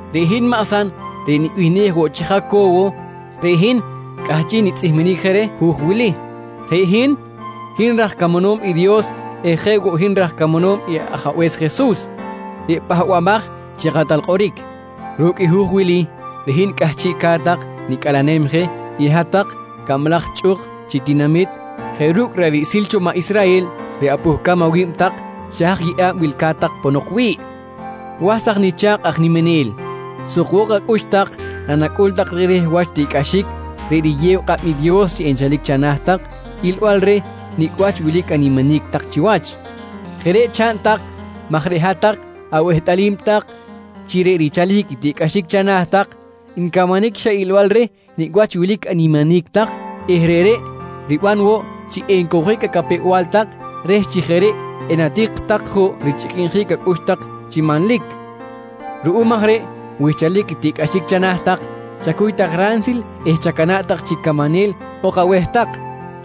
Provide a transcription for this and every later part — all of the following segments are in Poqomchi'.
Reꞌ hin maꞌ San reꞌ nibihnej woꞌ chi Jaco̱wo, reꞌ hin cꞌahchiꞌ nitzꞌihminic je reh hu̱j wili. Reꞌ hin, hin raj camanom i Dios eh jeꞌ woꞌ hin raj camanom i Ajabe̱s Jesus reꞌ Pahbamaj chi Kꞌatal Kꞌoric. Ru̱cꞌ i hu̱j wili reꞌ hin cꞌahchiꞌ ca̱t tak nicꞌalenem je i hat-tak cablaj chꞌuk chi tinamit jeꞌ ru̱cꞌ ra̱ꞌ riꞌsil cho maꞌ Israhel reꞌ apuhcam awi̱b tak xa haj yeꞌa̱b wilca̱t tak ponok wi̱ꞌ. Was tak nicha̱kꞌ aj niminel, sukbok acꞌux tak nanacꞌul tak rehreh wach tiꞌcꞌaxic reꞌ riyew kꞌab i Dios chi enchalic chana̱ tak ilbal reh nicꞌ wach wilic animinic tak chiwach. Jeꞌ reꞌ chaꞌn tak maj reꞌ hat-tak awehtꞌalim tak chi reꞌ richalic i tiꞌcꞌaxic chana̱ tak ncamanic xa ilbal reh nicꞌ wach wilic animinic tak eh reꞌreꞌ riban woꞌ chi encowjic acapew-bal tak reh chi jeꞌ reꞌ enatik tak juꞌ richꞌiquinjic acꞌux tak chi manlic. Ruꞌum aj reꞌ wi xchalic i tiꞌcꞌaxic chana̱ tak chacuy tak ransil eh chacana̱ꞌ tak chi camanel ok aweh tak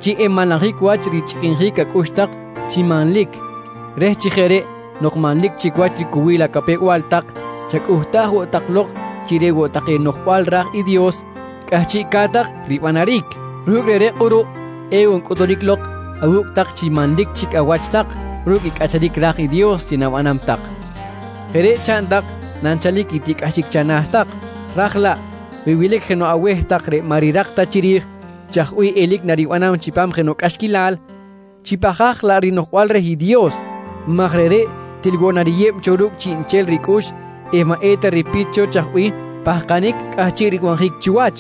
chi enmanlajic wach richꞌiquinjic acꞌux tak chi manlic reh chi jeꞌ reꞌ nok manlic chic wach ricowil acapew-bal tak chacꞌuhtaj woꞌ tak lok chi reꞌ woꞌ take noꞌjbal ra̱j i Dios cꞌahchiꞌca̱t tak ribanaric. Ru̱cꞌ reꞌreꞌ kꞌuruꞌ ewoꞌ ncꞌutunic lok awu̱cꞌ tak chi manlic chic awach tak ru̱cꞌ i cꞌacharic ra̱j i Dios chi na̱banam tak. Jeꞌ reꞌ chaꞌn tak nanchalic i tiꞌcꞌaxic chana̱ tak ra̱j laꞌ wi wilic jenoꞌ aweh tak reꞌ maꞌ rirak ta chiri̱j chaj bih elic naribanam chipam jenoꞌ cꞌaxquilal, chipahkaj laꞌ rinoꞌjbal reh i Dios maj reꞌreꞌ til woꞌ nariyeb cho ru̱cꞌ chiꞌnchel ricꞌux eh maꞌ eta ripit cho chaj bih pahkanic cꞌahchiꞌ ribanjic chiwach.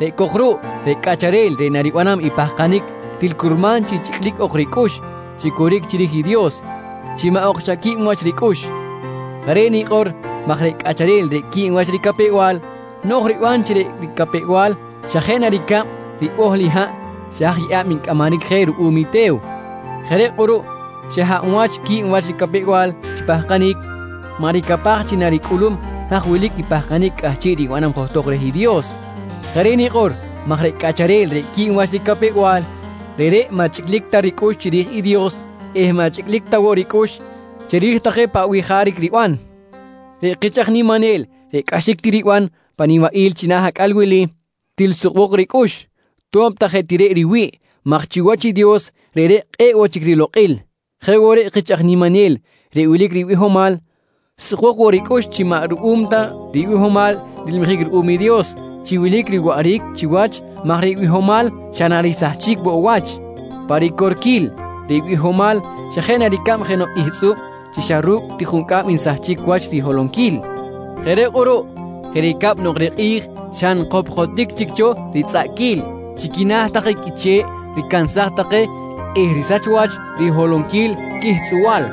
Reꞌ cok ruꞌ reꞌ cꞌacharel reꞌ naribanam i pahkanic til curman chi chꞌiclic ok ricꞌux chi coric chiri̱j i Dios chi maꞌ ok xa qui̱b wach ricꞌux. Jeꞌ reꞌ nikꞌor maj reꞌ cꞌacharel reꞌ qui̱b wach ricapew-bal no̱j riban chi reꞌ ricapew-bal xa jeꞌ na ricab ribohl i haꞌ xa haj yeꞌa̱b ncꞌamaric je ruꞌum i te̱w. Jeꞌ reꞌ kꞌuruꞌ xa hab wach qui̱b wach ricapew-bal chi pahkanic, maꞌ ricapaj chi naricꞌulum haj wilic i pahkanic cꞌahchiꞌ ribanam johtok reh i Dios. Jeꞌ reꞌ nikꞌor maj reꞌ cꞌacharel reꞌ qui̱b wach ricapew-bal, reꞌreꞌ maꞌ chꞌiclic ta ricꞌux chiri̱j i Dios eh maꞌ chꞌiclic ta woꞌ ricꞌux chiri̱j take paꞌ bih jaric riban. Reꞌ kich aj niminel reꞌ cꞌaxic ti riban pan nibaꞌil china̱ acꞌal wili, til sukbok ricꞌux to̱b ta jeꞌ ti reꞌ riwi̱ꞌ maj chiwach i Dios reꞌreꞌ kꞌe̱ꞌ woꞌ chic rilokꞌil. Jeꞌ woꞌ reꞌ kich aj niminel reꞌ wilic ribihomal, sukbok woꞌ ricꞌux chi maꞌ ruꞌum ta ribihomal nilmijic ruꞌum i Dios chi wilic riwaꞌric chiwach maj reꞌ bihomal xa narisahchic woꞌ wach. Pa ricorquil, reꞌ bihomal xa jeꞌ na ricab jenoꞌ ihtzꞌub chi xa ru̱cꞌ ti juncꞌam nsahchic wach riholonquil. Jeꞌ reꞌ kꞌuruꞌ, jeꞌ ricab nok reꞌ kꞌi̱j xa nkopkotic chic cho ritzꞌaꞌquil chi quina̱ take qꞌuiche̱ꞌ ricansaj take eh risach wach riholonquil quihtzꞌubal,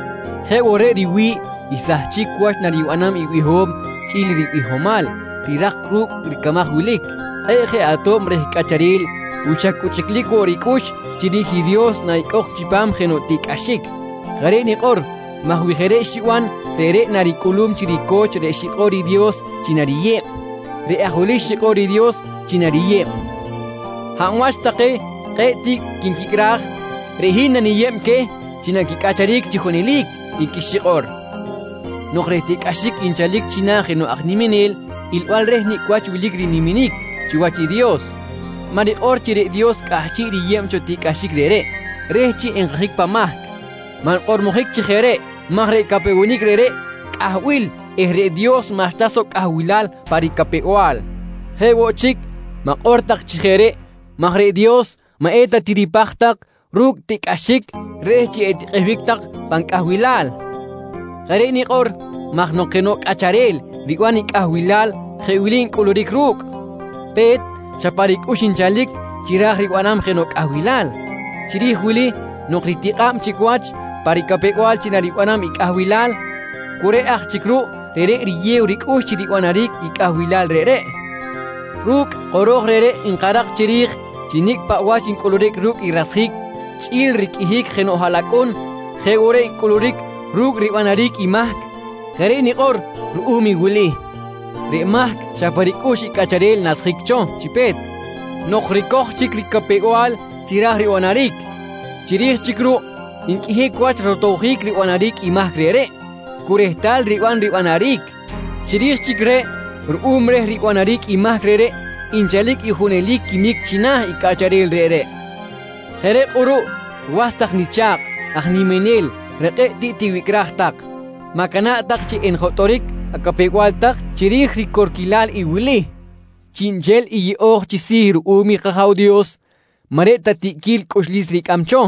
jeꞌ woꞌ reꞌ riwi̱ꞌ i sahchic wach naribanam i biho̱m chꞌi̱l i ribihomal rirak ru̱cꞌ ricamaj wilic. Kꞌe̱ꞌ je ato̱b reh cꞌacharel wi xa cu chꞌiclic woꞌ ricꞌux chiri̱j i Dios naꞌicꞌok chipam jenoꞌ tiꞌcꞌaxic. Jeꞌ reꞌ nikꞌor maj wi jeꞌ reꞌ xiban reꞌreꞌ naricꞌulum chi rico̱ch reꞌ xikꞌor i Dios chi nariyeb. Reꞌ aj wili xikꞌor i Dios chi nariyeb: “Hab wach take kꞌe̱ꞌ tiꞌ quinquicꞌraj, reꞌ hin naniyeb queh chi naquicꞌacharic chi junelic, nqui xikꞌor. Nok reꞌ tiꞌcꞌaxic nchalic china̱ jenoꞌ aj niminel ilbal reh nicꞌ wach wilic riniminic chiwach i Dios, maꞌ rikꞌor chi reꞌ Dios cꞌahchiꞌ riyeb cho tiꞌcꞌaxic reꞌreꞌ reh chi nkajic pan mahc. Maꞌ nkꞌormojic chi jeꞌ reꞌ maj reꞌ capewenic reꞌreꞌ cꞌahbil eh reꞌ Dios maꞌxta soꞌ cꞌahbilal pa ricapew-bal. Jeꞌ woꞌ chic, ma̱kꞌor tak chi jeꞌ reꞌ maj reꞌ Dios maꞌ eta tiripaj tak ru̱cꞌ tiꞌcꞌaxic reh chi etikꞌehbic tak pan cꞌahbilal. Jeꞌ reꞌ nikꞌor maj nok jenoꞌ cꞌacharel riban i cꞌahbilal jeꞌ wili ncꞌuluric ru̱cꞌ: Pe̱t, xa pa ricꞌux nchalic chi ra̱j ribanam jenoꞌ cꞌahbilal. Chiri̱j wili nok ritikꞌa̱b chic wach pa ricapew-bal chi naribanam i cꞌahbilal, cu reꞌ aj chic ruꞌ reꞌreꞌ riyew ricꞌux chi ribanaric i cꞌahbilal reꞌreꞌ. Ru̱cꞌ kꞌoro̱j reꞌreꞌ nkarak chiri̱j chi nicꞌ paꞌ wach ncꞌuluric ru̱cꞌ i rasjic chꞌi̱l riqꞌuihic jenoꞌ haꞌlacꞌun jeꞌ woꞌ reꞌ ncꞌuluric ru̱cꞌ ribanaric i mahc. Jeꞌ reꞌ nikꞌor ruꞌum i wili: Reꞌ mahc xa pa ricꞌux i cꞌacharel nasjic cho chi pe̱t nok ricoj chic ricapew-bal chi ra̱j ribanaric. Chiri̱j chic ruꞌ nqꞌuihic wach rotowjic ribanaric i mahc reꞌreꞌ cu rehtal riban ribanaric. Chiri̱j chic reꞌ ruꞌum reh ribanaric i mahc reꞌreꞌ, nchalic i junelic quimic china̱ i cꞌacharel reꞌreꞌ. Jeꞌ reꞌ kꞌuruꞌ was tak nicha̱kꞌ aj niminel reꞌ kꞌe̱ꞌ tiꞌ tiwicꞌraj tak, ma̱cana̱ꞌ tak chi enjotꞌoric acapew-bal tak chiri̱j ricorquilal i wili: Chiꞌnchel i yeꞌo̱j chi si̱ ruꞌum i kAja̱w Dios maꞌ reꞌ ta tiꞌquil cꞌuxlis ricꞌam cho,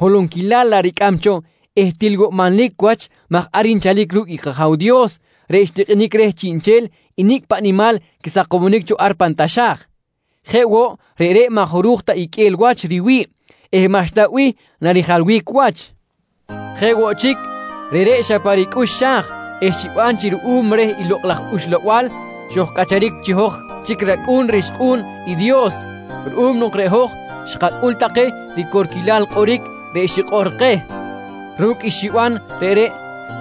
holonquilal laꞌ ricꞌam cho eh til woꞌ manlic wach maj ar nchalic ru̱cꞌ i kAja̱w Dios reꞌ xtikꞌinic reh chiꞌnchel i nicꞌ paꞌ nimal quisakomonic cho ar pan taxa̱j. Jeꞌ woꞌ reꞌreꞌ maꞌ jaruj ta iqꞌue̱l wach riwi̱ꞌ eh maꞌxta bih narijalbic wach. Jeꞌ woꞌ chic, reꞌreꞌ xa pa ricꞌux xa̱j eh xiban chi ruꞌum reh i Lokꞌ laj Uxlabal xojcꞌacharic chi hoj chic racꞌu̱n rixkꞌu̱n i Dios ruꞌum nok reꞌ hoj xkacꞌul take ricorquilal kꞌoric reꞌ xikꞌor keh. Ru̱cꞌ i xiban reꞌreꞌ,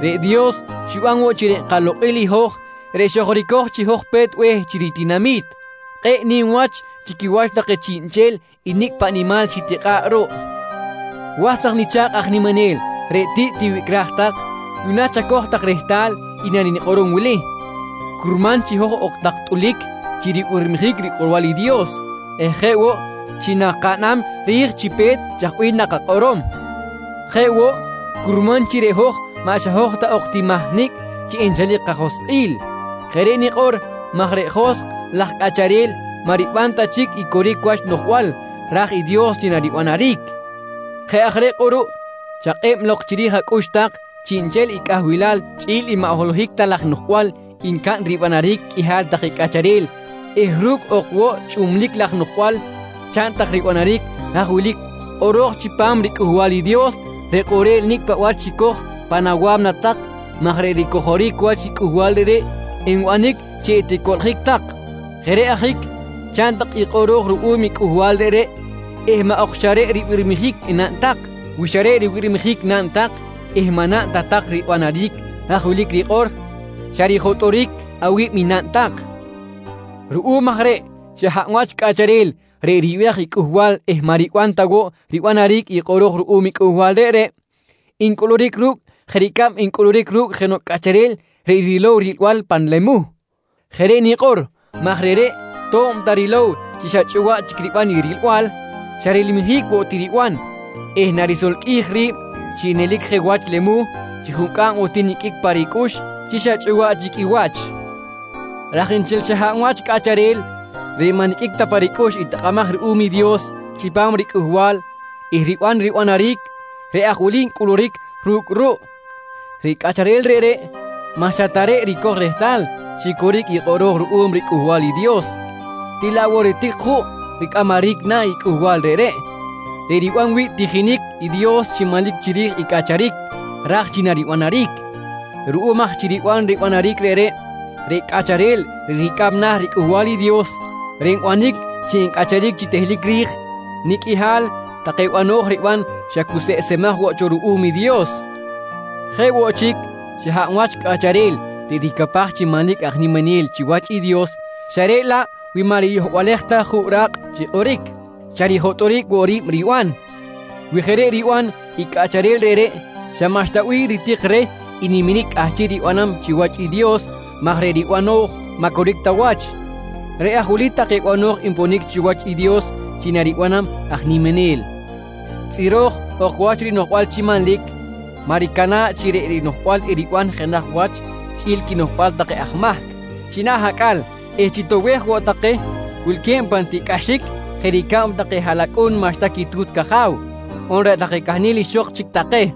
reꞌ Dios xiban woꞌ chi reꞌ kalokꞌil i hoj reꞌ xojricoj chi hoj pe̱t be̱h chi ritinami̱t, kꞌe̱ꞌ nim wach chi quiwach take chiꞌnchel i nicꞌ paꞌ nimal xitikꞌa̱ꞌ ruꞌ. Was tak nicha̱kꞌ aj niminel reꞌ tiꞌ tiwicꞌraj tak, yuꞌna chacoj tak rehtal i nanikꞌorom wili: Curman chi hoj ok tak tꞌulic chi ribirmijic rikꞌorbal i Dios eh jeꞌ woꞌ chi nakaꞌnam ri̱j chi pe̱t chaj bih nakakꞌorom. Jeꞌ woꞌ, curman chi reꞌ hoj maꞌ xa hoj ta ok ti mahnicꞌ chi enchalic kajoskꞌil. Jeꞌ reꞌ nikꞌor maj reꞌ joskꞌ laj cꞌacharel maꞌ riban ta chic i coric wach noꞌjbal ra̱j i Dios chi naribanaric. Jeꞌ aj reꞌ kꞌuruꞌ chakꞌeb lok chiri̱j acꞌux tak chiꞌnchel i cꞌahbilal chꞌi̱l i maꞌ holohic ta laj noꞌjbal ncaꞌn ribanaric qꞌuihal take cꞌacharel eh ru̱cꞌ ok woꞌ chꞌublic laj noꞌjbal chaꞌn tak ribanaric haj wilic kꞌoro̱j chipam riCꞌuhbal i Dios reꞌ kꞌorel nicꞌ paꞌ wach xicoj pan awa̱mna tak maj reꞌ ricojoric wach i cꞌuhbal reꞌreꞌ enbanic chi eticoꞌljic tak. Jeꞌ reꞌ ajic chaꞌn tak i kꞌoro̱j ruꞌum i cꞌuhbal reꞌreꞌ eh maꞌ ok xa reꞌ ribirmijic enaꞌn tak. Wi xa reꞌ ribirmijic naꞌn tak eh maꞌ naꞌn ta tak ribanaric haj wili rikꞌor, xa rijotꞌoric awi̱b i naꞌn tak. Ruꞌum aj reꞌ xa hab wach cꞌacharel reꞌ ribiraj i cꞌuhbal eh maꞌ riban ta woꞌ ribanaric i kꞌoro̱j ruꞌum i cꞌuhbal reꞌreꞌ ncꞌuluric ru̱cꞌ jeꞌ ricab ncꞌuluric ru̱cꞌ jenoꞌ cꞌacharel reꞌ rilow i rilbal pan lemuh. Jeꞌ reꞌ nikꞌor maj reꞌreꞌ to̱b ta rilow chi xa chꞌuwaꞌ chic riban i rilbal, xa rilmijic woꞌ ti riban eh narisolqꞌuij ri̱b chi nelic je wach lemuh chi juncꞌam woꞌ ti niqꞌuic pa ricꞌux chi xa chꞌuwaꞌ chic i wach. Raj nchel xa hab wach cꞌacharel reꞌ maꞌ niqꞌuic ta pa ricꞌux i takꞌamaj ruꞌum i Dios chipam riCꞌuhbal eh riban ribanaric, reꞌ aj wili ncꞌuluric ru̱cꞌ ruꞌ: Reꞌ cꞌacharel reꞌreꞌ maꞌ xa ta reꞌ ricoj rehtal chi coric i kꞌoro̱j ruꞌum riCꞌuhbal i Dios til laꞌ woꞌ ritik juꞌ ricꞌamaric na̱ i cꞌuhbal reꞌreꞌ, reꞌ riban wi̱ꞌ tijinic i Dios chi manlic chiri̱j i cꞌacharic ra̱j chi naribanaric. Ruꞌum aj chi riban ribanaric reꞌreꞌ, reꞌ cꞌacharel reꞌ ricꞌam na̱ riCꞌuhbal i Dios reꞌ nbanic chi encꞌacharic chi tehlic ri̱j, nicꞌ qꞌuihal take bano̱j riban xa cuseꞌsemaj woꞌ cho ruꞌum i Dios. Jeꞌ woꞌ chic, xa hab wach cꞌacharel reꞌ ricapaj chi manlic aj niminel chiwach i Dios xa reꞌ laꞌ wi maꞌ riyohbalej ta juꞌ ra̱kꞌ chi kꞌoric, xa rijotꞌoric woꞌ ri̱b riban. Wi jeꞌ reꞌ riban i cꞌacharel reꞌreꞌ, xa maꞌxta bih ritik reh i niminic cꞌahchiꞌ ribanam chiwach i Dios maj reꞌ ribano̱j maꞌ coric ta wach. Reꞌ aj wili take bano̱j nponic chiwach i Dios chi nariban i aj niminel: Tzꞌiro̱j ok wach rinoꞌjbal chi manlic, maꞌ ricana̱ꞌ chi reꞌ rinoꞌjbal eriban jenaj wach chꞌi̱l quinoꞌjbal take aj mahc china̱ eh chitoꞌbej woꞌ take wilque̱b pan tiꞌcꞌaxic jeꞌ ricab take haꞌlacꞌun maꞌxta quitu̱t caja̱w on reꞌ take cahnel ixok chic take.